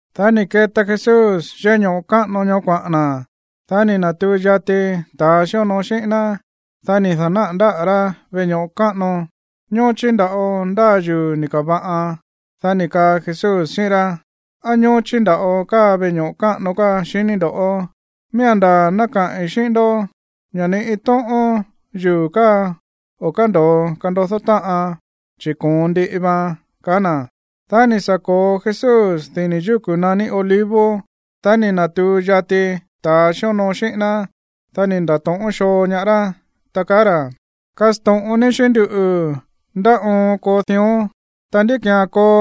Dá ni̱ keta Jesús yéꞌé ño̱ꞌo káꞌano ñoó kuaꞌa̱n na̱. Dá ni̱ na̱tuu yati ta̱a xíonoo xíꞌín ná. Dá ni̱ da̱náꞌa̱ ndáꞌa̱ rá veꞌe ño̱ꞌo káꞌano, ña̱ ñóchí nda̱ꞌo ndáa yuu̱ ni̱ ka̱va̱ꞌan. Dá ni̱ kaa Jesús xíꞌín rá: ―¿Á ñóchí nda̱ꞌo káa veꞌe ño̱ꞌo káꞌano káa, xiní ndo̱? Miía̱n ndaa̱ ná kaꞌi̱n xíꞌín ndó ña̱ ni iin tóꞌón yuu̱ káa o̱ kándo̱o kandodó táꞌan, chi̱ koon ndiꞌi vaan ―kaá na̱. Dá ni̱ sa̱ ko̱o Jesús dini̱ yúku̱ naní Olivos. Dá ni̱ na̱tuu yati ta̱ xíonoo xíꞌín ná. Dá ni̱ nda̱to̱ꞌón xoo ñaá rá, ta kaá ra̱: ―Kasto̱ꞌon ní xíꞌín nduꞌu̱, ¿ndá oon koo dión, ta ndí ki̱án koo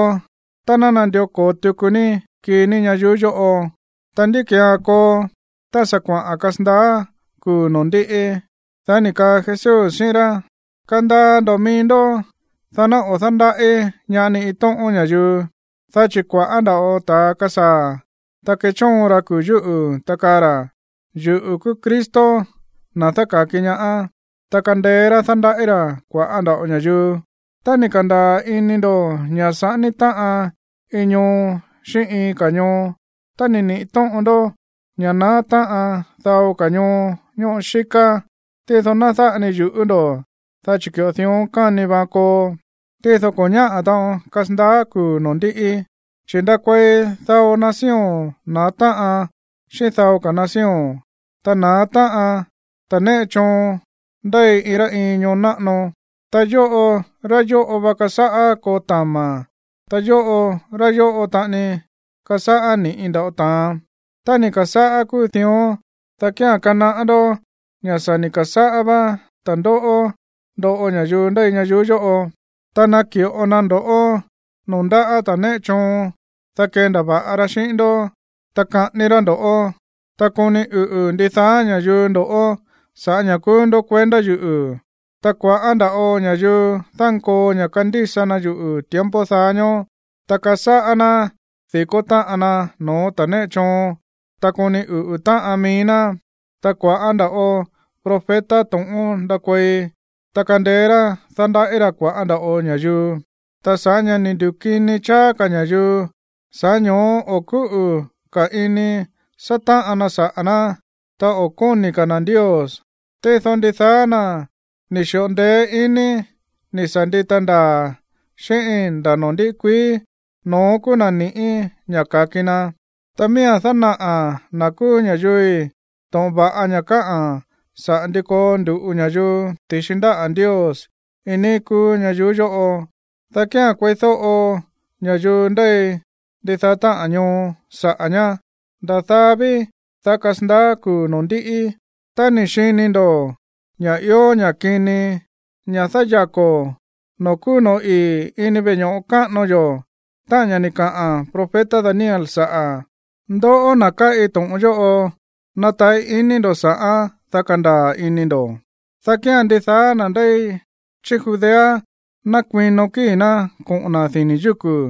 tá nandió ko̱o tuku ní kii ní ñayuú yóꞌo? Ta, ¿ndí ki̱án koo tá sa̱ kuaꞌa̱n kasandaá kuu̱ noo̱ ndíꞌi? Dá ni̱ kaa Jesús xíꞌín rá: ―Kandaa ndo̱ mií ndó, dá ná o̱ dándaꞌí ñaá ni iin tóꞌón ña̱yuu, dá chi̱ kua̱ꞌá nda̱ꞌo ta̱a kasaa̱, ta kechóon ra kuu̱ yúꞌu̱, ta kaa ra̱: “Yuꞌu̱ kúú Cristo, na̱ dáka̱ki ñaá”, ta kandeé rá dándaꞌí ra̱ kua̱ꞌá nda̱ꞌo ña̱yuu. Tá ni̱ ka̱ndaa̱ ini ndo̱ ña̱ saꞌání táꞌan iin ñoo xíꞌín iin ka̱ ñoo, ta ni̱ niꞌi̱ tóꞌon ndó ña̱ naá táꞌan dao ka̱ ñoo ñóꞌo xíká, tído ná dáꞌa ni yu̱ꞌú ndo̱, dá chi̱ ki̱ꞌo dión káni vaan koo, tído ko̱ ñáꞌa̱ taꞌon kasandaá kuu̱ noo̱ ndiꞌi. ’Chi̱ ndakuei dao nación na̱á táꞌan xíꞌín dao ka̱ nación, ta na̱á táꞌan ta̱ néꞌe choon ndéi iin rá iin ñoo náꞌano. Ta yóꞌo rá yóꞌo va kasáꞌá koo tama̱, ta yóꞌo rá yóꞌo taꞌani kasáꞌá ni̱ꞌi nda̱ꞌo ta̱an. Tá ni̱ ka̱sáꞌá kúu dión, dá kía̱n kanaꞌá ndó ña̱ sa̱ ni̱ ka̱sáꞌá vá ta̱ndóꞌó ndoꞌo ña̱yuu ndéi ñayuú yóꞌo. ’Ta naki̱ꞌo na ndo̱ꞌó noo̱ ndáꞌa̱ ta̱ néꞌe choon, dá kendava̱ꞌa ra xíꞌín ndó, ta kaꞌání rá ndo̱ꞌó. Ta koni uꞌu̱ ndidaá ña̱yuu ndo̱ꞌó sa̱ꞌá ña̱ kúú ndó kuendá yuꞌu̱. Ta kua̱ꞌá nda̱ꞌo ña̱yuu dánkoo ña̱ kándísa na yuꞌu̱ tiempo daá ñóó, ta kasáꞌá ná di̱kó táꞌan na no̱ó ta̱ néꞌe choon, ta koni uꞌu̱ táꞌan mií ná. Ta kua̱ꞌá nda̱ꞌo profeta to̱ꞌón ndakuei, ta kandeé rá dándaꞌí ra̱ kua̱ꞌá nda̱ꞌo ña̱yuu. Ta sa̱ꞌá ña̱ ni̱ ndukini cháá ka̱ ña̱yuu, sa̱ꞌá ño̱ó o̱ kúꞌu̱ ka̱ ini sátáꞌan na saꞌa̱ ná, ta o̱ kóni̱ ka̱ na̱ Ndios. Tído ndidaá na̱ ni̱ xi̱ꞌo ndeé iní ni̱ sa̱ ndita ndaa̱ xíꞌíín nda̱ noo̱ ndiꞌi kuií, no̱ón kúú na̱ ni̱ꞌí ña̱ ka̱ki na. Ta miía̱n dánaꞌa̱ na̱ kúú ña̱yuui̱ to̱ꞌon va̱ꞌa ña̱ káꞌa̱n saꞌa̱ ndi koo ndu̱ꞌu ña̱yuu ti̱xi ndáꞌa̱ Ndios iin níí kúú ñayuú yóꞌo, dá kía̱n kueídóꞌo ña̱yuu ndéi ndidaá táꞌa̱n ñoo saꞌa̱ ñá, nda̱ daá ví, dá kasandaá kuu̱ noo̱ ndíꞌi. ’Tá ni̱ xini ndo̱ ña̱ ió ña̱ kini, ña̱ dáyako̱ noo̱ kúú no̱ó ii̱ ini veꞌe ño̱ꞌo káꞌano yo̱, táꞌa̱n ña̱ ni̱ kaꞌa̱n profeta Daniel saꞌa̱ ―ndoꞌó, na̱ káꞌi to̱ꞌon yóꞌo, nataꞌí iní ndo̱ sa̱ꞌán, dá kandaa̱ ini ndo̱―, dá kía̱n ndidaá na̱ ndéi chí Judea ná kuino kíi̱ ná koꞌo̱n na̱ dini̱ yúku̱.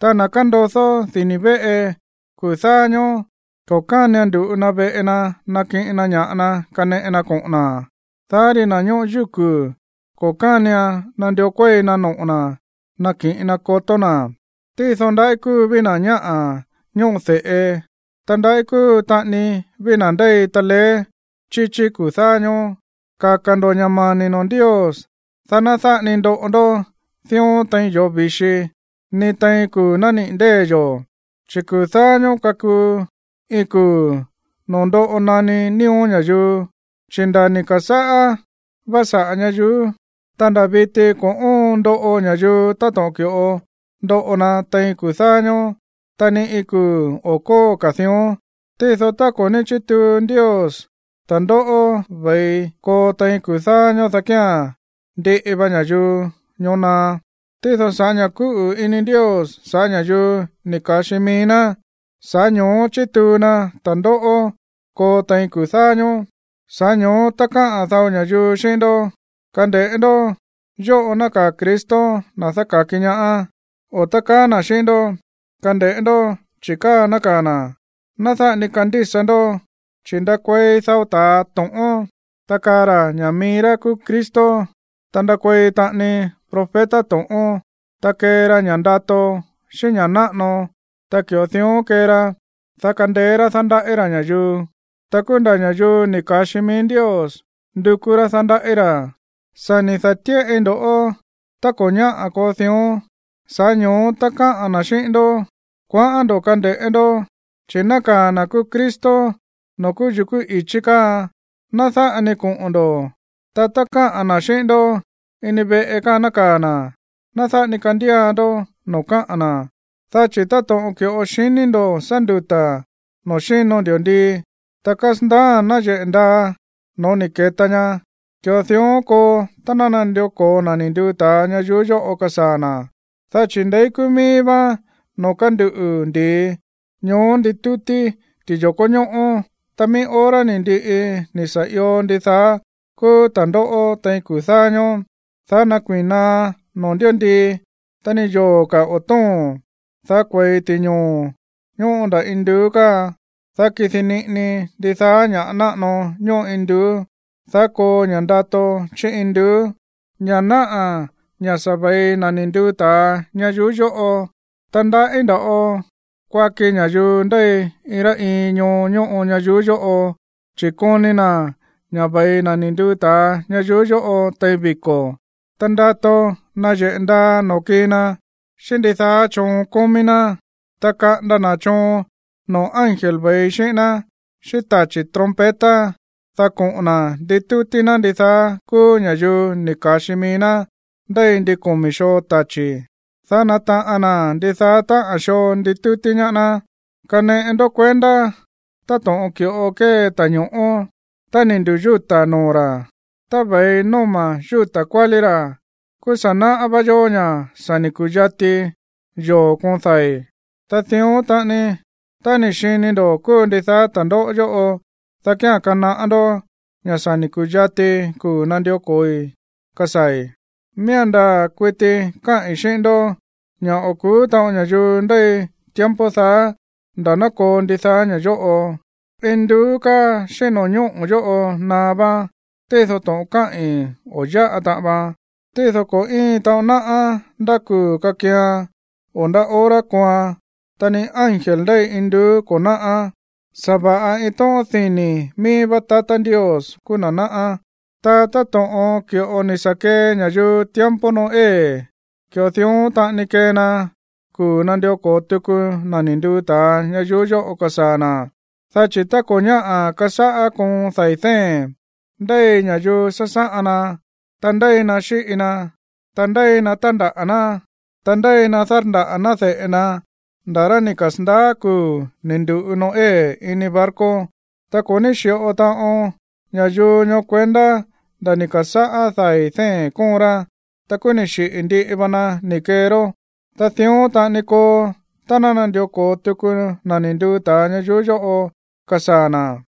Ta na̱ kándodó dini̱ véꞌe kuu̱ dáá ñóó, ko̱ kánian ndu̱ꞌu na veꞌe na nakiꞌin na ña̱ꞌa na kaneꞌe na koꞌo̱n na̱. Dá ri na̱ ñóꞌo yúku̱, ko̱ kánian nandió kuéi na noꞌo̱ na̱ nakiꞌin na kotó na̱. Tído ndaꞌí kúu ví na̱ ñáꞌa̱ ñóꞌo de̱ꞌe. Ta ndaꞌí kúu taꞌani ví na̱ ndéi taleé chíchí kuu̱ dáá ñóó. Kaka̱ ndo̱ ña̱ mani̱ noo̱ Ndios, dá ná dáꞌa ni ndoꞌo ndó dión tein yoo̱ vi̱xi, ni tein kuu̱ nániꞌi̱ ndée̱ yo̱. ’Chi̱ kuu̱ dáá ñóó kakuu iin kuu̱ noo̱ ndoꞌo naní nío̱ ña̱yuu. Chi̱ nda̱ ni̱ ka̱sáꞌá vá saꞌa̱ ñayuú, ta nda̱ viti ko̱ óon ndoꞌo ña̱yuu táto̱ꞌon ki̱ꞌo ndoꞌo na tein kuu̱ dáá ñóó. Ta ni iin kuu̱ o̱ kóo ka̱ dión. Tído tá ko̱ ní chítuu Ndios ta̱ndóꞌó ve̱i koo tein kuu̱ dáá ñóó, dá kía̱n ndiꞌi va ña̱yuu ñoó naá. Tído sa̱ꞌá ña̱ kúꞌu̱ ini Ndios sa̱ꞌá ña̱yuu ni̱ ka̱xi mií ná, sa̱ꞌá ño̱ó chituu na ta̱ndóꞌó koo tein kuu̱ dáá ñóó. ’Sa̱ꞌá ño̱ó tá kaa dao ña̱yuu xíꞌín ndó: “Kande̱ꞌé ndó, yóꞌo nákaa̱ Cristo, na̱ dáka̱ki ñaá”, o tá kaa na̱ xíꞌín ndó “Kande̱ꞌé ndó, chi̱ káa nákaa̱ na̱”, ná dáꞌa ni kandísa ndó. Chi̱ ndakuei dao ta̱a to̱ꞌón, ta kaa ra̱ ña̱ mií rá kúú Cristo. Ta ndakuei taꞌani profeta to̱ꞌón. Ta kee ra ña̱ ndato, xíꞌín ña̱ náꞌano, ta ki̱ꞌo dión kee ra, dá kandeé rá dándaꞌí ra̱ ña̱yuu, ta kúú nda̱ ña̱yuu ni̱ ka̱xi mií Ndios ndukú rá dándaꞌí ra̱. Sa̱ ni̱ da̱tíꞌai ndo̱ꞌó tá ko̱ ñáꞌa̱ koo dión. Sa̱ꞌá ño̱ó tá kaa na̱ xíꞌín ndó: “Kuaꞌán ndo̱ kande̱ꞌé ndó, chi̱ nákaa̱ na̱ kúú Cristo noo̱ kúú yukú i̱chí káa”, ná dáꞌa ni koꞌo̱n ndo̱. Ta tá kaa na̱ xíꞌín ndó: “Ini veꞌe káa nákaa̱ na̱”, ná dáꞌa ni kandía ndó no̱ó kaꞌa̱n na̱. Dá chi̱ táto̱ꞌon ki̱ꞌo xiní ndo̱ sá nduta̱ noo̱ xíno ndi̱ndii, ta kasandaá nayeꞌe̱ nda̱ no̱ó ni̱ ke̱ta ña, ki̱ꞌo dión koo tá nandió ko̱o na̱ ni̱ nduu ta̱a ñayuú yóꞌo kasaa̱ na̱. Dá chi̱ ndeí kúú mií vá noo̱ kánduꞌu̱ ndi̱i, ñoó nditútí ti̱yo̱kó ñóꞌó. ’Ta mií hora ni̱ ndiꞌi ni̱ sa̱ io ndidaá kúú ta̱ndóꞌó tein kuu̱ dáá ñóó, dá nákuii̱n naá no̱ó ndi̱ndii, ta ni yoo̱ ka̱ o̱ tóo̱n. Dá kue̱i ti̱ñoo̱ ñóꞌo ndá induú káa, ta kidi niꞌini ndidaá ña̱ꞌa náꞌano ñóꞌo induú. Dá koo ña̱ ndato chí induú, ña̱ náꞌa̱ ña̱ sa̱ ve̱i na̱ ni̱ nduu ta̱a ñayuú yóꞌo. Ta ndaꞌí nda̱ꞌo kuaki ña̱yuu ndéi iin rá iin ñoo ñóꞌo ñayuú yóꞌo, chi̱ koni na̱ ña̱ ve̱i na̱ ni̱ nduu ta̱a ñayuú yóꞌo tein viko̱, ta ndato nayeꞌe̱ ndaa noo̱ kii na xíꞌín ndidaá choon kómí ná. Ta kaꞌanda na̱ choon noo̱ ángel ve̱i xíꞌín ná xíꞌín tachi̱ trompeta, dá koꞌo̱n na̱ nditútí ná ndidaá kúú ña̱yuu ni̱ ka̱xi mií ná ndéi ndin komi̱ xoo tachi̱, dá nátaꞌan na̱ ndidaá táꞌa̱n xoo nditútí ñaá ná. ’Kaneꞌe ndó kuendá táto̱ꞌon ki̱ꞌo kée ta̱ño̱ꞌó. Tá ni̱ ndu̱yúta̱ noo̱ ra̱, ta ve̱i nóma̱ yúta̱ kuálí ra̱, kúú sa̱ náꞌá vá yó ña̱ sa̱ ni̱ ku̱yati yoo̱ koon dai̱. Ta dión taꞌani, tá ni̱ xini ndo̱ kúu ndidaá ta̱ndóꞌó yóꞌo, dá kía̱n kanaꞌá ndó ña̱ sa̱ ni̱ ku̱yati kuu̱ nandió ko̱oi kasaa̱i̱. ’Miía̱n ndaa̱ kuiti káꞌi̱n xíꞌín ndó ña̱ o̱ ku̱ú taꞌon ña̱yuu ndéi tiempo daá nda̱ ná koo ndidaá ña̱ yóꞌo. Induú káa xíꞌín no̱ñóꞌo̱ yóꞌo naá váán, tído to̱ꞌon káꞌi̱n, o̱ yáꞌa taꞌan vaan. ’Tído ko̱ íin taꞌon náꞌá ndá kuu̱ kakian o ndá hora kooan, ta ni ángel ndéi induú ko̱ náꞌá. Sa̱va̱ꞌa iin tóꞌón dini̱ míí vá tatá Ndios kúú na̱ náꞌá. ’Ta táto̱ꞌon ki̱ꞌo ni̱ sa̱ kee ña̱yuu tiempo Noé, ki̱ꞌo dión taꞌani kee na kuu̱ nandió ko̱o tuku na̱ ni̱ nduu ta̱a ñayuú yóꞌo kasaa̱ na̱. Dá chi̱ tá ko̱ ñáꞌa̱ kasáꞌá koon dai̱ dée̱n, ndéi ña̱yuu sásáꞌan na, ta ndéi na xíꞌi na, ta ndéi na tándaꞌa̱ ná, ta ndéi na dárndaꞌa̱ ná de̱ꞌe na nda̱ rá ni̱ kasa̱ndaá kuu̱ ni̱ ndu̱ꞌu Noé ini barco. Ta ko̱ ní xi̱ꞌo taꞌon ña̱yuu ñoó kuendá nda̱ ni̱ ka̱sáꞌá dai̱ dée̱n kóon ra. Ta kúú ni xiꞌi̱ ndiꞌi va na ni̱ kee rá. Ta dión taꞌani koo tá ná nandió ko̱o tuku na̱ ni̱ nduu ta̱a ñayuú yóꞌo kasaa̱ na̱.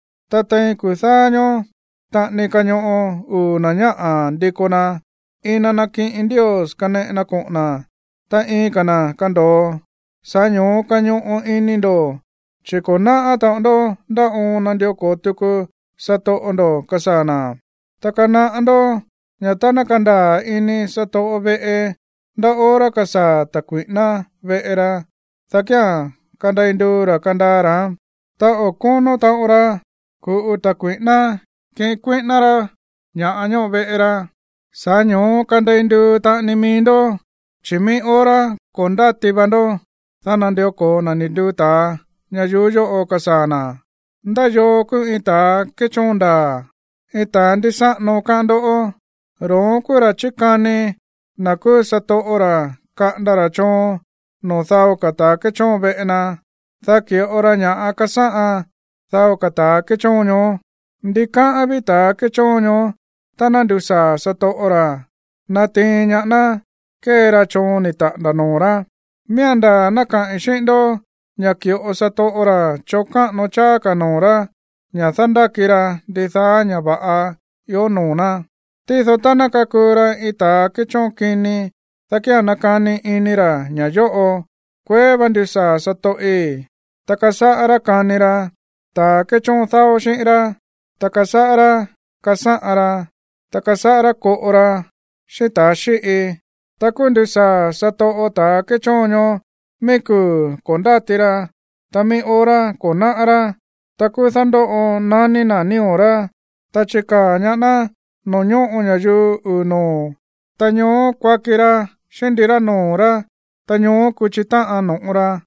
Ta tein kuu̱ dáá ñóó taꞌani kañoꞌo uu̱ na̱ ñáꞌa̱ ndiko na. Iin na nakiꞌin Ndios kaneꞌe na koꞌo̱n na̱, ta iin ka̱ na̱ kando̱o. Sa̱ꞌá ño̱ó kañoꞌo ini ndo̱, chi̱ ko̱ náꞌá taꞌon ndó ndá oon nandió ko̱o tuku satoꞌo ndo̱ kasaa̱ na̱. ’Ta kanaꞌá ndó ña̱ tá ná kandaa̱ ini satoꞌo veꞌe ndá hora kasaa̱ ta̱ kui̱ꞌíná veꞌe ra, dá kía̱n kandei nduu ra̱ kandaa ra̱án, ta o̱ kónó taꞌon ra ku̱ꞌu ta̱ kui̱ꞌíná kiꞌin kuíꞌíná rá ña̱ꞌa ñóꞌo veꞌe ra. Sa̱ꞌá ño̱ó kandei nduu taꞌani mií ndó, chi̱ mií hora ko̱ ndáti va ndó, dá nandió ko̱o na̱ ni̱ nduu ta̱a ñayuú yóꞌo kasaa̱ na̱. ’¿Ndá yoo kúú iin ta̱ kéchóon ndaa̱, iin ta̱a ndísáꞌano, káꞌán ndó? Ro̱ón kúú ra̱ chikani na̱ kúú satoꞌo ra̱ kaꞌanda ra̱ choon noo̱ dao ka̱ ta̱ kéchóon veꞌe na, dá ki̱ꞌo ra ña̱ꞌa kasáꞌan dao ka̱ ta̱ kéchóon ñoó. Ndikáꞌán ví ta̱ kéchóon ñoó tá ná ndusaa̱ satoꞌo ra̱ natiin ñaá ná kée ra choon ni̱ taꞌa̱nda̱ noo̱ rá. Miía̱n ndaa̱ ná kaꞌi̱n xíꞌín ndó ña̱ ki̱ꞌo satoꞌo ra̱ choon káꞌano cháá ka̱ noo̱ rá ña̱ dándáki ra ndidaá ña̱ va̱ꞌa ió noo̱ ná. Tído tá ná kakuu ra iin ta̱ kéchóon kini, dá kía̱n nakani ini ra̱ ña̱ yóꞌo: “Kueé vá ndusaa̱ satoꞌi̱”, ta kasáꞌá rá kani ra ta̱ kéchóon dáó xíꞌín rá, ta kasáꞌá rá kasáꞌan ra, ta kasáꞌá rá koꞌo ra xíꞌín ta̱ xíꞌi, ta kúú ndusaa̱ satoꞌo ta̱ kéchóon ñoó mií kuu̱ ko̱ ndáti ra, ta mií hora ko̱ náꞌá rá. Ta kúú dándóꞌo naní na̱ nío̱ rá, ta chikaa̱ ñaá ná noo̱ ñóꞌo ña̱yuu uu̱ noo̱, ta ñoó kuaki ra xíꞌín ndirá noo̱ rá, ta ñoó kuchi táꞌan no̱ꞌo ra.